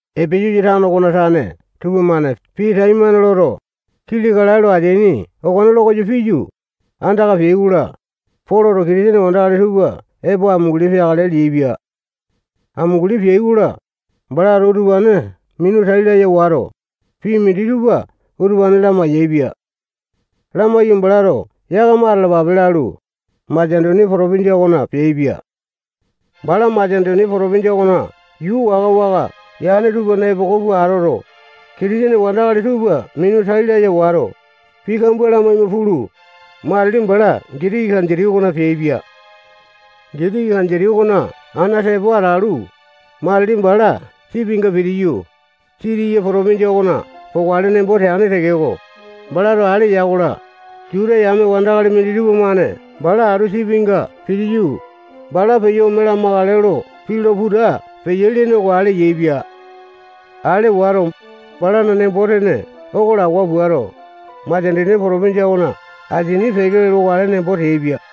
Epesasa tano okona tane tupamane pii taimane loto, kili kalae lo ateaini okone lokoyo piyu, andaka peai-kola, Poloto Kitisene wandakali tupa epo amunguli peakale leaipia. Amunguli peai-kola, balato utupane minu tai laya wato, pii minditupa utupane lamai-yaepia. Lamaiyu, balato yakama atalapape lalu, Masetonia potopinjia okona peaipia. Bala Masetonia potopinjia okona yuu waka-waka yane tupana epoko pua atoto, Kitisene wandakali tupa minu tai laya wato, pii kambua lamaima pulu, matili bala Gitiki kanditi okona peaipia. Gitiki kanditi okona ana tepo atalu, matili bala sipinga pitiyu, Sitiya potopinjia okona pokale nembo teane tekeko, balato ale ya-kola, Juta yame wandakali minditupa-mane bala atu sipinga pitiyu, bala peyo ome lamakale lo pii lo puta piyai lene oko ale yaepia. Ale wato, balana nembo-tene oko lawa puato, Masetonia potopinjia okona asini peke lokale nembo teaipia.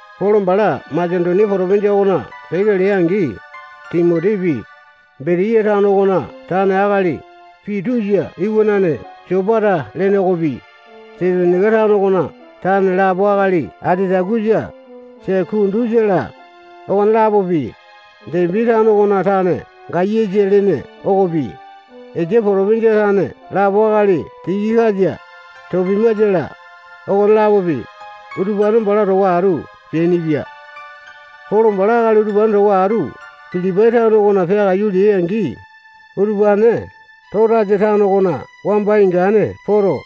Polo bala Masetonia potopinjia okona peke lea-angi, Timotipi, Betiya tano okona tane akali Pitusa iwanane Sopata lene okopi, Tesalonaika tano okona tane lapo akali Atitakusa, Sekundusa-la, okone-lapopi, Depi tano okona tane Gayasa lene okopi, Esia potopinjia tane lapo akali Tikikasa, Topimasa-la, okone-lapopi, utupane bala towa atu peainipia. Polo bala akali utupane towa atu Pilipai tano okona peakaiyu leai-angi, utupane Totasa tano okona wamba ingane poto,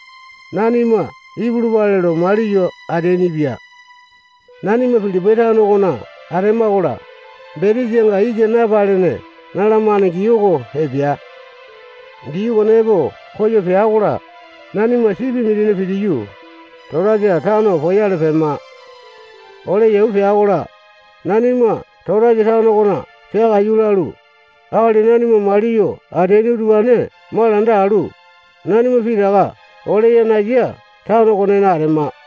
nanima ipulupale lo maliyo ateainipia. Nanima Pilipai tano okona atema-kola, betesanga yisa napalene nalamane gii oko epea. Gii okone epo koyo pea-kola, nanima sipi mindina pitiyu, Totasa tano poyale pema. Ole yau pea-kola, nanima Totasa tano okona peakaiyu lalu, akali nanima maliyo ateaini utupane malanda alu, nanima pitaka ole yanasa tano okonena atema.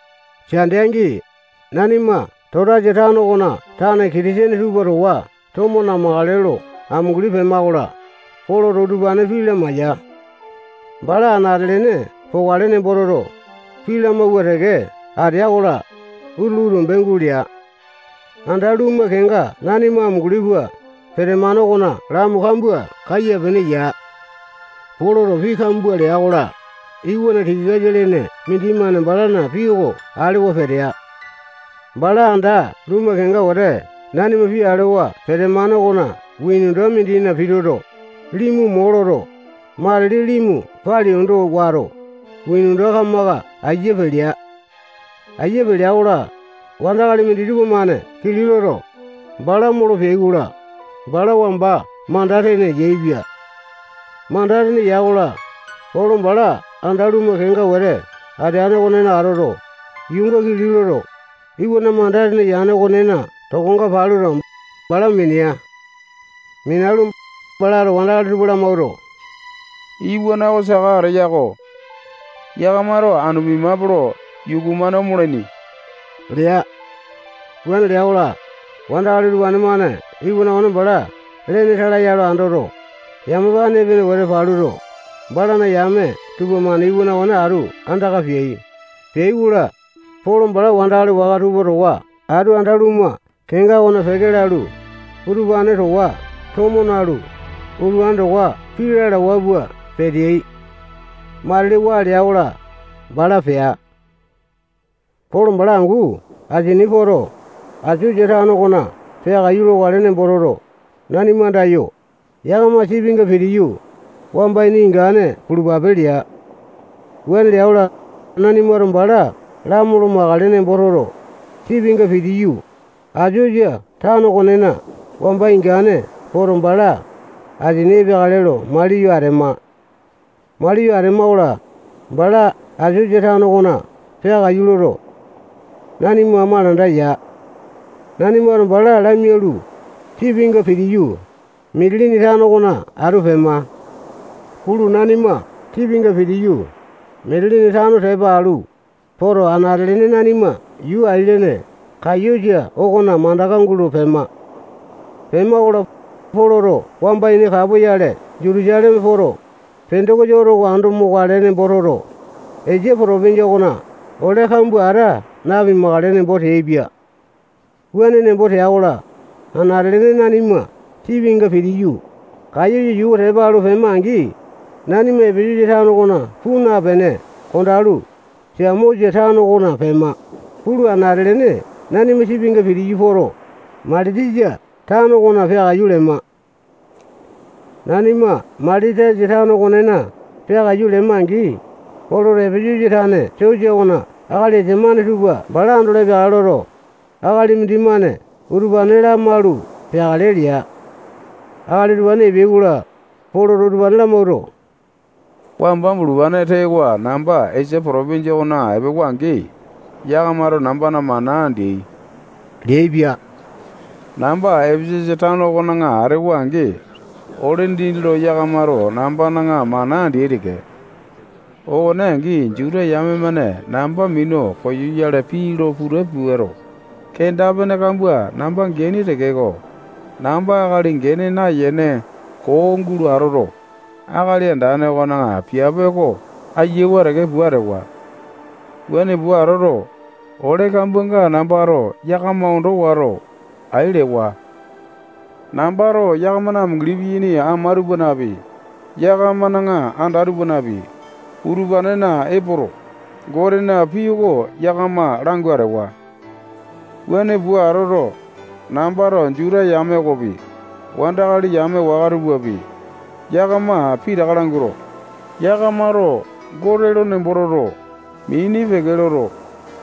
Sande angi, nanima Totasa tano okona tane Kitisene tupa towa tomo namakale lo amunguli pema-kola, Poloto utupane pii lamaiya. Bala anate-lene pokale nembo toto, pii lamawua teke atea-kola, utulu tombe gulea. Anda lumu kenga nanima amunguli pua petemane okona lamu kambua kaya-pene ya. Poloto pii kambua lea-kola, iwana Yutikasa lene mindimane balana pii oko alewa petea. Bala anda lumu kenga wete nanima pii alewa petemane okona windowa mindina pituto, limu mo loto, matili limu pali ondo wato, windowa kamaka aiya pelea. Aiya pelea-kola, wandakali minditupa-mane kili loto, bala molo peai-kola, bala wamba manda tene yaepia. Manda tene ya-kola, Polo bala anda lumu kenga wete ateane okonena atoto, yuunga kili loto, iwana manda tene yane okonena tokonga paluto, bala minea. Minalu, balato wandakali tupa lamawuato, iwana oko saka ateya-ko. Yakamato anu pimape lo yuku-mane omolaini lea. Wuane lea-kola, wandakali utupane-mane iwana okone bala lene tala ya lo andoto, yamapane epene wete paluto, balana yame tupamane iwana okone atu andaka peai. Peai-kola, Polo bala wandakali waka tupa towa atu anda lumu kenga okona peke lalu, utupane towa tomo nalu, utupane towa pii lalawa pua peteai. Matili, waa lea-kola, bala pea. Polo bala angu asini poto, Asosa tano okona peakaiyu lokale nembo toto, nanima andayo, yakama sipinga pitiyu, wamba ini ingane pulupape lea. Wuane lea-kola, nanimato bala lamolo makale nembo toto, sipinga pitiyu, Asosa tano okonena wamba ingane poto, bala asini epeakale lo maliyo atema. Maliyo Atema-kola, bala Asosa tano okona peakaiyu loto, nanima malanda ya. Nanimato bala lamialu, sipinga pitiyu, Mitilini tano okona atu pema. Pulu, nanima sipinga pitiyu, Mitilini tano tepa alu poto, anate-lene nanima yuu ailene Kayosa okona mandaka gulo pema. Pema-kola, Poloto wamba ini kapoyale Jutusaleme poto, Pendokosa oto oko ando mokale nembo toto, Esia potopinjia okona ole kambua ata napukale nembo teaipia. Wuane nembo tea-kola, anate-lene nanima sipinga pitiyu, Kayosa yuu oko tepa alu pema-angi, nanima Epesasa tano okona puu napene kondalu, Samosa tano okona pema. Pulu, anate-lene nanima sipinga pitiyu poto, Mailitasa tano okona peakaiyu lema. Nanima Mailitasa tano okonena peakaiyu lema-angi, Poloto Epesasa tane sosa okona akali esamane tupa bala andolo epeakale loto, akali mindimane utupane lamaulu peakale lea. Akali utupane epeai-kola, Poloto utupane lamawuato, wamba bulupane tewa namba Esia potopinjia okona epewa-angi, yakamato nambana mana andeai leaipia. Namba Epesasa tano okona atewa-angi, ole dindi lo yakamato nambana mana andeai teke. Okone angi, Juta yame-mane namba minu koyoyale pii lo puta puato, kenda-pene kambua namba geaini tekeko, namba akali gene nayene koo gulo atoto, Akali Andane okona piape oko ayawa teke pua atewa. Wuane pua atoto, ole kambuanga nambato yakama ondo wato, ai lewa. Nambato yakamana amunguli piyaini ama tupanapi, yakamana anda tupanapi, utupanena epoto, Gotena pii oko yakama langu atewa. Wuane pua atoto, nambato Juta yame okopi, wandakali yame waka tupapi, yakama pitaka languato, yakamato Gote lo nembo toto, mini peke loto,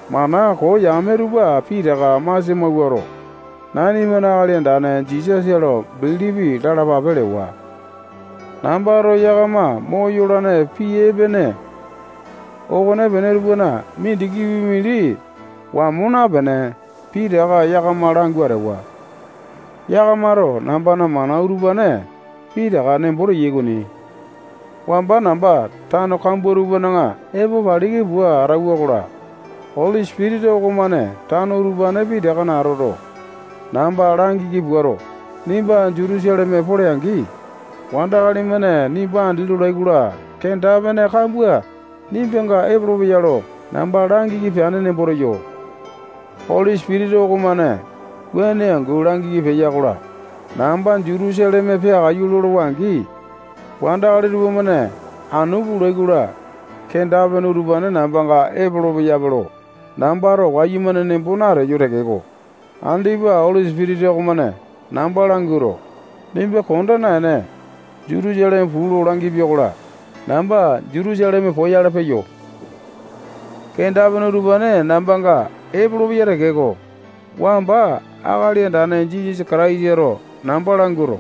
mana koo yame tupa pitaka masia mawuato, nanimana Akali Andane Jisasa lo bilipi lalapape lewa. Nambato yakama moyolane pii epene okonepene tupana mindikipi mindi wamo napene, pitaka yakama langu atewa. Yakamato nambana mana utupane pitaka nembo teyai okoni. Wamba namba tano kambua tupana epo paliki pua atauwa-kola, Oli Sipitisa okomane tano utupane pitakana atoto, namba langiki puato, nimba Jutusaleme pole-angi, wandakali-mane nimba andi lolai-kola, kenda-pene kambua nimbanga epolopeya lo namba langiki peane nembo teyo. Oli Sipitisa okomane wuane angu lo namba langiki peya-kola, namba Jutusaleme peakaiyu lolowa-angi, wandakali tupamane anu pulai-kola, kenda-pene utupane nambanga epolo-peyape lo nambato wayumane nembo nateyo tekeko, andipa Oli Sipitisa okomane namba languato, nimba konda naene, Jutusaleme puu lo langipia-kola, namba Jutusaleme poyale peyo. Kenda-pene utupane nambanga epolopeya tekeko, wamba Akali Andane Jisasa Kataisato namba languato,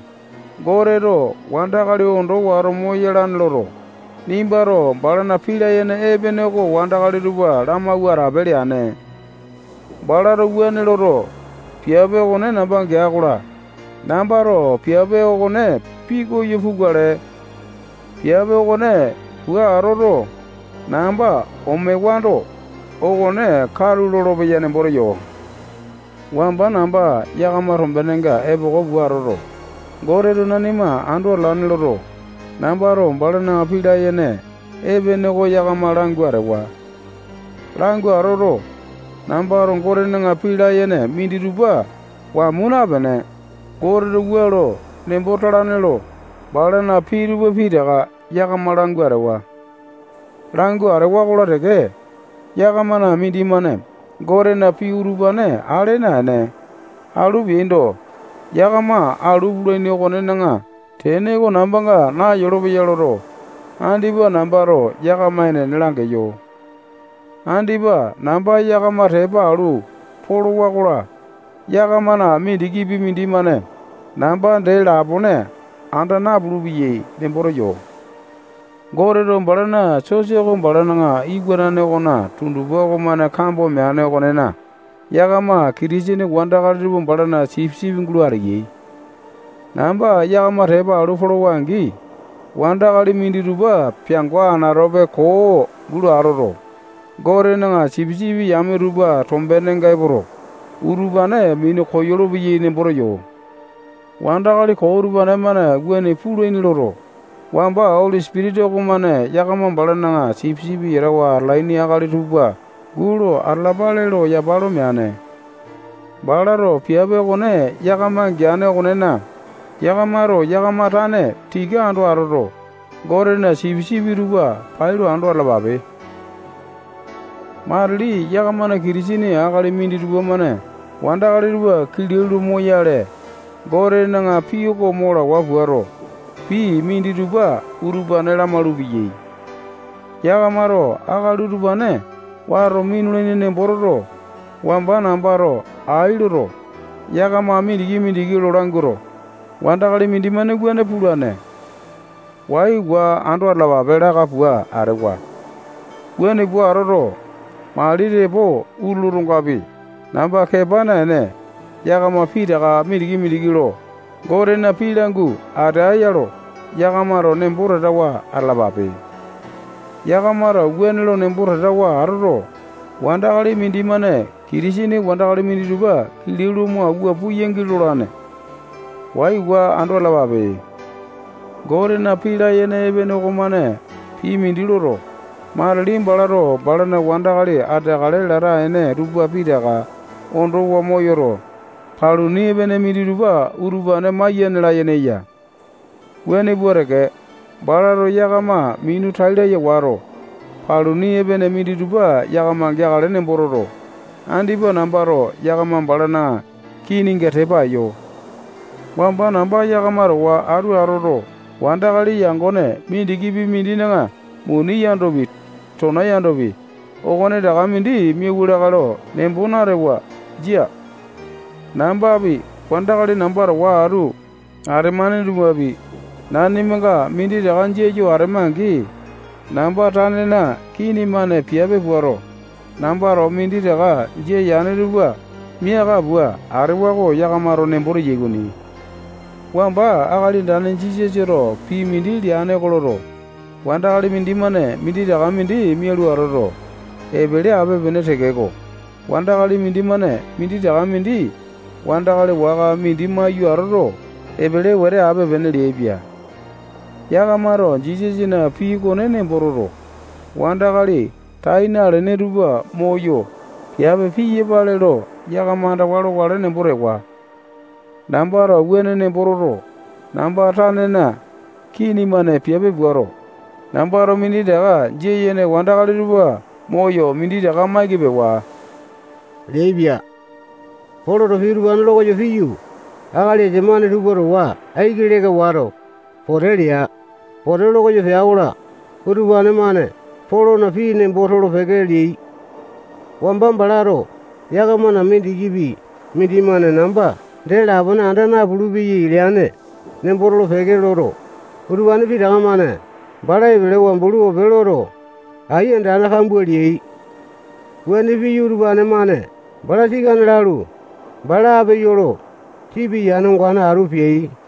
Goteto wandakali ondo wato moyalane loto, nimbato balana pii layene epene oko wandakali tupa lamawua atape leane. Balato wuane loto, piape okone namba gea-kola, nambato piape okone pikoyo pukale. Piape okone pua atoto, namba omewando, okone katu lolopeya nembo teyo. Wamba namba yakama tombenenga epoko pua atoto, Goteto nanima ando atalane loto, nambato balana pii layene epene oko yakama langu atewa. Langu atoto, nambato Gotena pii layene minditupa wamo napene, Goteto wua lo nembo talane lo balana pii tupa pitaka yakama langu atewa. Langu atewa-kola teke, yakamana mindimane Gotena pii utupane ale naene, alu peaindo, yakama alu pulaini okonena tene oko nambanga nayolopeya loto, andipa nambato yakama enene langeyo. Andipa namba yakama tepa alu polowa-kola, yakamana mindikipi mindimane namba dee lapone anda napulu-peyai nembo teyo. Goteto balana sosa oko balana iwanane okona tundupa okomane kambo meane okonena, yakama Kitisene wandakali tupa balana sipisipi gulo ateyai. Namba yakama tepa alu polowa-angi, wandakali minditupa peango anatope koo gulo atoto, Gotena sipisipi yame tupa tombenenga epoto, utupane minu koyolo-peyai nembo teyo. Wandakali koo utupane-mane wuane pulaini loto, wamba Oli Sipitisa okomane yakama balana sipisipi yatawa atalaini akali tupa gulo atalapale lo yapa lo meane. Balato piape okone yakama geane okonena, yakamato yakama tane tika ando atoto, Gotena sipisipi tupa pailo ando atalapape. Matili yakamana Kitisene akali minditupa-mane wandakali tupa kilau lo moyale, Gotena pii oko mo lawa puato, pii minditupa utupane lamalu-peyai. Yakamato akali utupane wato minulaini nembo toto, wamba nambato ai loto, yakama mindiki-mindiki lo languato, wandakali mindimane wuane pulane. Waiwa ando atalapape laka pua atewa. Wuane pua atoto, mali tepo utulu otongapi, namba kepa naene, yakama pitaka mindiki-mindiki lo Gotena pii langu atea lo yakamato nembo tatawa atalapape. Yakamato wuane lo nembo tatawa atoto, wandakali mindimane Kitisene wandakali minditupa kilau lo mo awua puyangi lolane. Waiwa ando atalapape. Gotena pii layene epene okomane pii mindi loto, matili balato balana wandakali ateakale lata ene tupa pitaka ondowa moyoto, paluni epene minditupa utupane maiyane layene eya. Wuane pua teke, balato yakama minu tai laya wato, paluni epene minditupa yakama geakale nembo toto, andipa nambato yakama balana kininga tepa eyo. Wamba namba yakama towa atu atoto, wandakali yangone mindikipi mindina muni yandopi, tona yandopi, okonetaka mindi miauwa lakae lo nembo natewa. Jia. Nambapi, wandakali namba towa atu atemane tupapi, nanimanga minditaka jia yo atema-angi, namba tanena kini-mane piape puato, nambato minditaka jia yane tupa miaka pua atewa lo yakamato nembo teyai okoni. Wamba Akali Andane Jisasato pii mindi leane oko loto, wandakali mindimane minditaka mindi mialu atoto, epele ape-pene tekeko, wandakali mindimane minditaka mindi wandakali waka mindi maiyu atoto, epele wete ape-pene leaipia. Yakamato Jisasana pii okone nembo toto, wandakali tai nalene tupa moyo piape piyapale lo yakama andawa lokale nembo tewa. Nambato wuane nembo toto, namba tanena kini-mane piape puato, nambato minditaka jia yene wandakali tupa moyo, minditaka maiki pewa leaipia. Poloto pii utupane lokoyo piyu, akali esamane tupa towa aiki leka wato, pote lea. Pote lokoyo pea-kola, utupane-mane Polona pii nembo tolo-peke leai. Wamba balato yakamana mindikipi mindimane namba dee lapone anda napulu-peyai leane nembo tolo-peke loto, utupane pitaka-mane bala epelewa bulu ope loto, ai andane kambua leai. Wuane piyu, utupane-mane bala sikane lalu, bala ape yolo, sipi yane ongane atu peai.